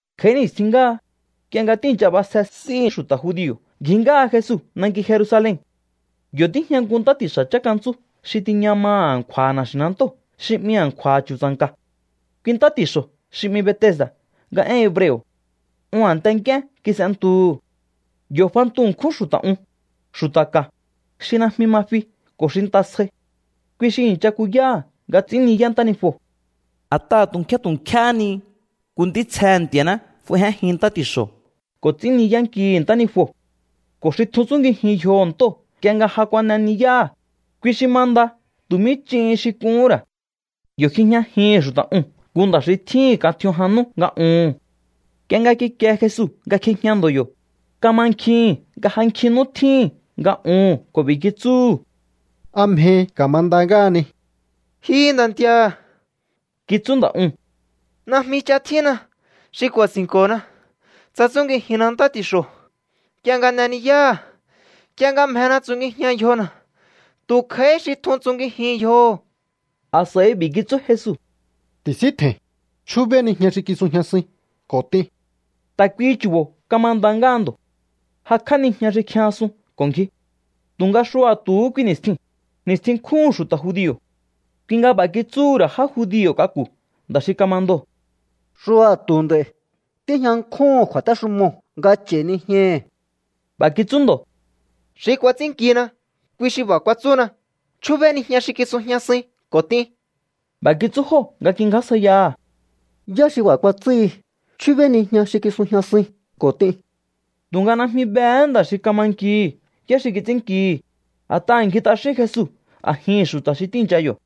Kj'a̱í ni̱stjin ngáha, nk'ie nga tíi̱ncha b'asje s'íhi̱ xu̱ta̱ judio̱ ngji ngáha Jesu nanki Jerusalen. Yo̱ tíjña nku ntá ti̱xa̱ chánkantsú xi tiña maha̱ a̱nkju̱a̱ha̱ na̱xi̱nantóo̱ xi 'mi A̱nkju̱a̱ Chu̱tsa̱nka̱. Kui ntá ti̱xo̱ xi 'mi Betesda̱ nga én hebreo̱. Un a̱nte nk'íén kis'entuhu̱. Yo̱ fantu ṉkjún xu̱ta̱ un, xu̱ta̱ ka̱, xi najmi ma fi ko̱ xi nta sjai. Kui xi i̱ncha kuyáha̱ nga ts'ín ni̱yá ntánijuo̱. A̱t'aha̱ tu̱ nkjé tu̱ nkjéhé ni nku ntítsjehe̱ Nti̱a̱ná f'aijénjin ntá ti̱xo̱ ko̱ ts'ín ni̱yánkihi̱ ntánijuo̱. Ko̱ xi tjun tsungijin yjoho̱ ntóo̱ nk'ie nga ja kuan'e ni̱yáha̱, kui xi ma nda tu̱ mí ch'in xi k'uhún ra̱. Yo̱ kjijñajihi̱n xu̱ta̱ uu̱n nku nda̱ xi tjíhi̱n kan tj'ion jan nú nga uhu̱n. Nk'ie nga kikie Jesu nga kjijña ndo̱ yo̱, kamankjihi̱n nga ja nkjin nú tjíhi̱n nga uhu̱n ko̱ b'i̱ kitsúhu̱: —¿A mjehi ka̱ma nda ngáhani? —Ji nda̱ nti̱a̱ —kitsú nda̱ uu̱n—, najmi ch'a tjínna xi ku̱a̱si̱nko̱na, tsa tsúngijinna ntá ti̱xo̱ nk'ie nga n'e ni̱yáha̱. Nk'ie nga mjena tsungijian yjona̱, tu̱ kj'a̱íhí xi tjun tsungijin yjoho̱. A̱s'a̱i b'i̱ kitsú Jesu: —Ti̱síntje̱i̱n, chjúbéí nijña xi kisujñasuin ko̱ t'in. Ta̱ kuihi chu̱bo̱ kama nda ngáha ndo̱. Jakj'á nijña xi kjijñasun ko̱ ngji. Tu̱nga xua̱tu̱hú kui ni̱stjiu̱n, ni̱stjin nkjúhu̱n xu̱ta̱ judio̱. Kui nga b'a̱ kitsúhu̱ ra̱ já judio̱ k'aku̱ nda̱ xi kama ndoo̱: —Xua̱tu̱ nd'a̱i̱. Tíjña nkjúhu̱n kju̱a̱téxumoo̱ nga ch'a̱i̱ nijñahi̱. B'a̱ kitsú ndo̱: —Xi kuats'ínnkina, kui xi b'a̱ kuatsúna: “Chjúbéí nijña xi kisujñasuin ko̱ t'in.” B'a̱ kitsú jóo̱ nga kingjásjaiyaha̱: —¿Yá xi b'a̱ kuatsúhi: “Chjúbéí nijña xi kisujñasuin ko̱ t'in”? Tu̱nga najmi behé nda̱ xi kama nkihi̱ yá xi kits'ínnkihi̱, a̱t'aha̱ ngji t'axín Jesu a̱jihi̱n xu̱ta̱ xi tíi̱ncha yo̱.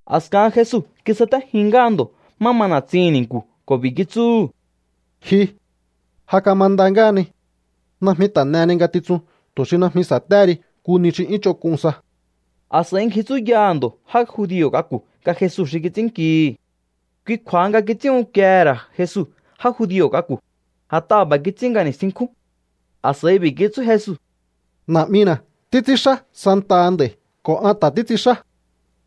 A̱skahan Jesu kisatéjin ngáha ndo̱ má ma na̱tsihi̱n ni̱nku̱ ko̱ b'i̱ kitsúhu̱: —Ji, ja kama nda ngáhani. Najmi ta̱ n'eheni ngatitsun tu̱ xi najmi sa̱téhe ri nku ni xi 'yún ch'onk'un sa. A̱s'a̱i ngji tsúyaha̱ ndo̱ já judio̱ k'aku̱ nga Jesu xi kits'ínnkihi̱. Kui kju̱a̱ha nga kits'ín unkiehe̱ ra̱ Jesu já judio̱ k'aku̱, a̱t'aha̱ b'a̱ kits'ín nga ni̱stjin nkjúu̱n. A̱s'a̱i b'i̱ kitsú Jesu: —Na̱'mina̱ títs'ínxá santaha nd'a̱i̱ ko̱ an ta̱ títs'inxá.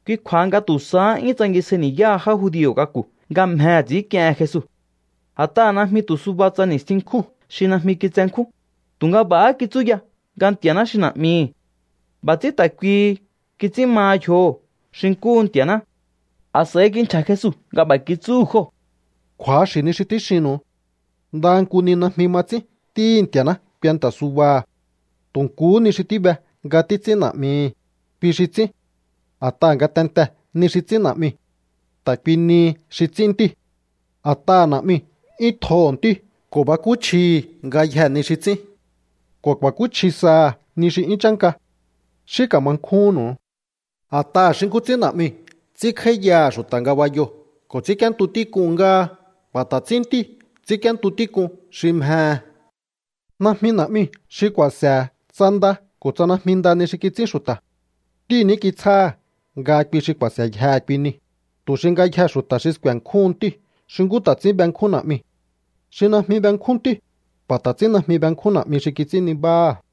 Kui kju̱a̱ha nga tu̱ sahá 'yún tsangisjai ni̱yáha já judio̱ k'aku̱ nga mjehe̱ ts'i̱ínk'iehen Jesu. A̱t'aha̱ najmi tu̱ suba tsa ni̱stjin nkjúu̱n xi najmi kitsenkjún, tu̱nga b'a̱há kitsú ya nga Nti̱a̱ná xi Na̱'mihi̱. B'a̱ ts'ín ta̱ kuihi kits'ín ma yjoho̱ xi nkúhu Nti̱a̱ná. A̱s'a̱i kinchja̱ Jesu nga b'a̱ kitsúhu̱ jóo̱: —Kju̱axi̱ ni xi tíxinnu̱u. Ndaha nku ni najmi ma ts'ín Ntíhi̱ Nti̱a̱ná kuenta̱ subaha̱. Tu̱ nkuhú ni xi tíbe nga títs'ín Na̱'mihi̱, kui xi ts'ín. A̱t'aha̱ ngatentee̱ ni xi ts'ín Na̱'miu̱, ta̱ kui nihi xi ts'ín Ntíu̱. A̱t'aha̱ Na̱'miu̱ 'yún tjoho̱ Ntíu̱ ko̱ bakúchjihi̱ ngayjee̱ ni xi ts'ín. Ko̱ ku̱a̱kúchji saha̱ ni xi 'yún chánka. Xí ka̱ma nkjúhúnnu̱u. A̱t'aha̱ xi nkú ts'ín Na̱'miu̱ ts'ínkj'áíyaha̱ xu̱ta̱ ngabayoo̱ ko̱ ts'ínk'íéntu tík'un ngáha, b'a̱ ta̱ ts'ín Ntíu̱ ts'ínk'íéntu tík'un xi mjehe̱. Najmi Na̱'miu̱ xi ku̱a̱se̱he̱ tsa nda ko̱ tsa najmi nda ni xi kits'ín xu̱ta̱. Ntíu̱ ní kitsjáha̱ nga kui xi ku̱a̱se̱yjehe̱ kui niu̱, tu̱ xi ngayjee̱ xu̱ta̱ sku̱e̱nkjúhun Ntíu̱ xi nkú ta̱ ts'ín benkjún Na̱'miu̱. Xi najmi benkjún Ntíu̱, b'a̱ ta̱ ts'ín najmi benkjún Na̱'mi xi kits'ín nibáha̱.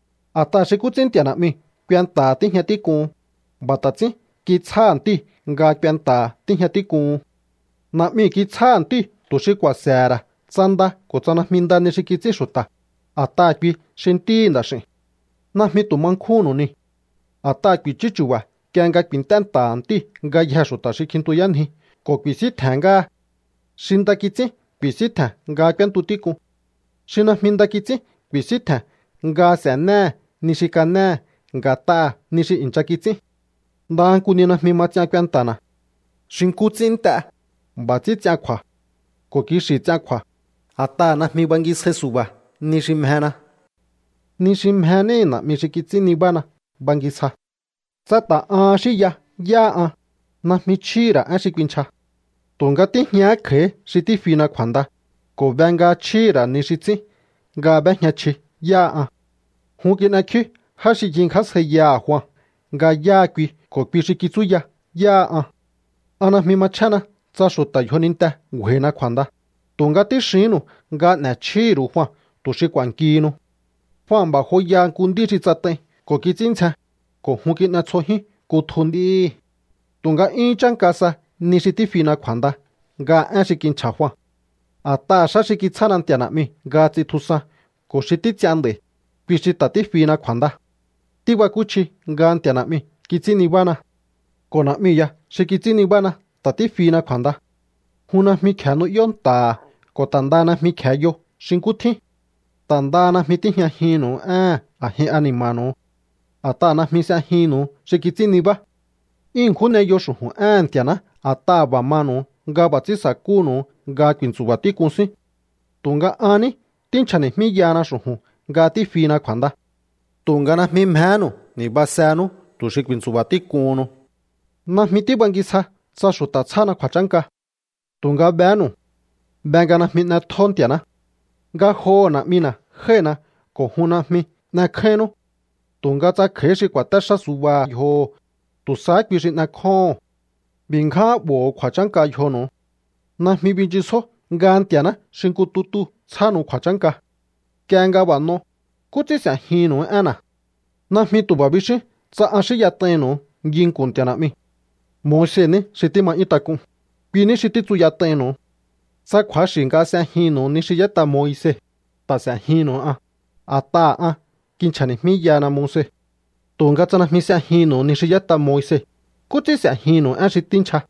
A̱t'aha̱ xi nkú ts'ín Nti̱a̱ Na̱'miu̱ kuenta̱ha̱ tíjña tík'uhun, b'a̱ ta̱ ts'ín kitsjáha̱ Ntíu̱ nga kuenta̱ha̱ tíjña tík'uhun. Na̱'miu̱ kitsjáha̱ Ntíu̱ tu̱ xi ku̱a̱se̱he̱ ra̱ tsa nda ko̱ tsa najmi nda ni xi kits'ín xu̱ta̱, a̱t'aha̱ kui xi Ntíhi̱ Nda̱x'i̱u̱n. ’Najmi tu̱ ma nkjúnnu̱u niu̱. A̱t'aha̱ ku̱i̱chú chu̱ba̱ nk'ie nga ku̱i̱nt'é nta̱ha̱ Ntíu̱ ngayjee̱ xu̱ta̱ xi kjintuyánji ko̱ ku̱i̱síntje̱n ngáha. Xi nda kits'ín ku̱i̱síntje̱n nga k'úéntu tík'un. Xi najmi nda kits'ín ku̱i̱síntje̱n nga s'e̱néhe̱ ni xi kanéhe̱ nga̱t'aha̱ ni xi i̱ncha kits'ín. Ndaha nku ni najmi ma ts'ian kuenta̱na̱. Xi nkú ts'ín nt'e, b'a̱ ts'ín ts'ian kju̱a̱. Ko̱ kixi̱ ts'ian kju̱a̱, a̱t'aha̱ najmi bangisjai su̱ba̱ ni xi mjena. Ni xi mje níhi̱ Na̱'mi xi kits'ín nibána bangisja. ’Tsa ta̱ ahan xínya yáha an, najmi chjíhi̱ ra̱ én xi kuinchja. Tu̱nga tíjñahá kj'a̱í xi tífina kju̱a̱nda, ko̱ be nga chjíhi̱ ra̱ ni xi ts'ín nga b'éjña chji yáha an. Jun kin'ekjíú já xi ngjingjásjaiyaha̱ Jua nga yáha kui ko̱ kui xi kitsúya yáha an. An najmi machjénna tsa xu̱ta̱ yjoninte ngju̱a̱i̱na kju̱a̱nda, tu̱nga tíxihínnu̱u nga n'e̱chjíhi̱ ru̱u Jua tu̱ xi k'u̱a̱nkihinu. Jua b'a̱ joyaha nku nd'í xi tsat'ai ko̱ kits'ín ndzjen, ko̱ jun kin'e tsjojiun kutju nd'íhi̱. ’Tu̱nga 'yún chánka sa ni xi tífina kju̱a̱nda nga én xi kinchja̱ Jua. A̱t'aha̱ xá xi kitsjána Nti̱a̱ Na̱'miu̱ nga ts'intjusan ko̱ xi títs'ian nd'a̱i̱, kui xi ta̱ tífina kju̱a̱nda. Tíbakúchji nga Nti̱a̱ Na̱'miu̱ kits'ín nibána. Ko̱ Na̱'miu̱ ya xi kits'ín nibána ta̱ tífina kju̱a̱nda. Jun najmi kje̱e nu'yó nta̱ha̱ ko̱ ta̱ ndaha najmi kje̱e yo xi nkú tjín. Ta̱ ndaha najmi tíjñajinnu̱u éhe̱n a̱jin ani̱ma̱nu̱u, a̱t'aha̱ najmi s'ejinnu̱u xi kits'ín nibá. 'Yún ṉkjún n'eyo xu̱ju̱n éhe̱n Nti̱a̱ná a̱t'aha̱ b'a̱ manu̱u nga b'a̱ ts'ín sa̱kúhu̱nu̱u nga ku̱i̱ntsu̱ba̱ tík'un síún. Tu̱nga an ní tínchja̱ni̱jmíyahana xu̱ju̱n nga tífina kju̱a̱nda. Tu̱nga najmi mjehénu̱u ni̱basenú tu̱ xi ku̱i̱ntsu̱ba̱ tík'uhunnu. ’Najmi tíbangisja tsa xu̱ta̱ tsjána kju̱a̱chánka. Tu̱nga behénu̱u. Be nga najmi n'etjó Nti̱a̱ná. Ngajoho̱ Na̱'mina̱ jái̱hina ko̱ jun najmi n'ekjáínnú. Tu̱nga tsa kj'a̱í xi ku̱a̱té xá subaha̱ yjoho̱, tu̱ sahá kui xi n'ekjóho̱on. B'i̱ ngján 'bo̱ho̱ kju̱a̱chánka yjonu̱u. Najmi binchisjó nga Nti̱a̱ná xi nku tutuu̱ tsjánu̱u kju̱a̱chánka. Nk'ie nga b'a̱ n'o, ¿nkú ts'ín s'e̱jihi̱nnu̱u énna̱? ’Najmi tu̱ b'a̱ bixíún tsa an xínyat'ainnu̱u nginku̱n Nti̱a̱ Na̱'miu̱. Moise ní xi tíma 'yún tak'un, kui ní xi títsuyat'ainnu̱u. Tsa kju̱axi̱ nga s'ejinnu̱u ni xi y'ét'a Moise, ta̱ s'e̱jinnu̱u an, a̱t'aha̱ an kinchja̱ni̱jmíyahana Moise. Tu̱nga tsa najmi s'ejinnu̱u ni xi y'ét'a Moise, ¿nkú ts'ín s'e̱jihi̱nnu̱u én xi tínchja?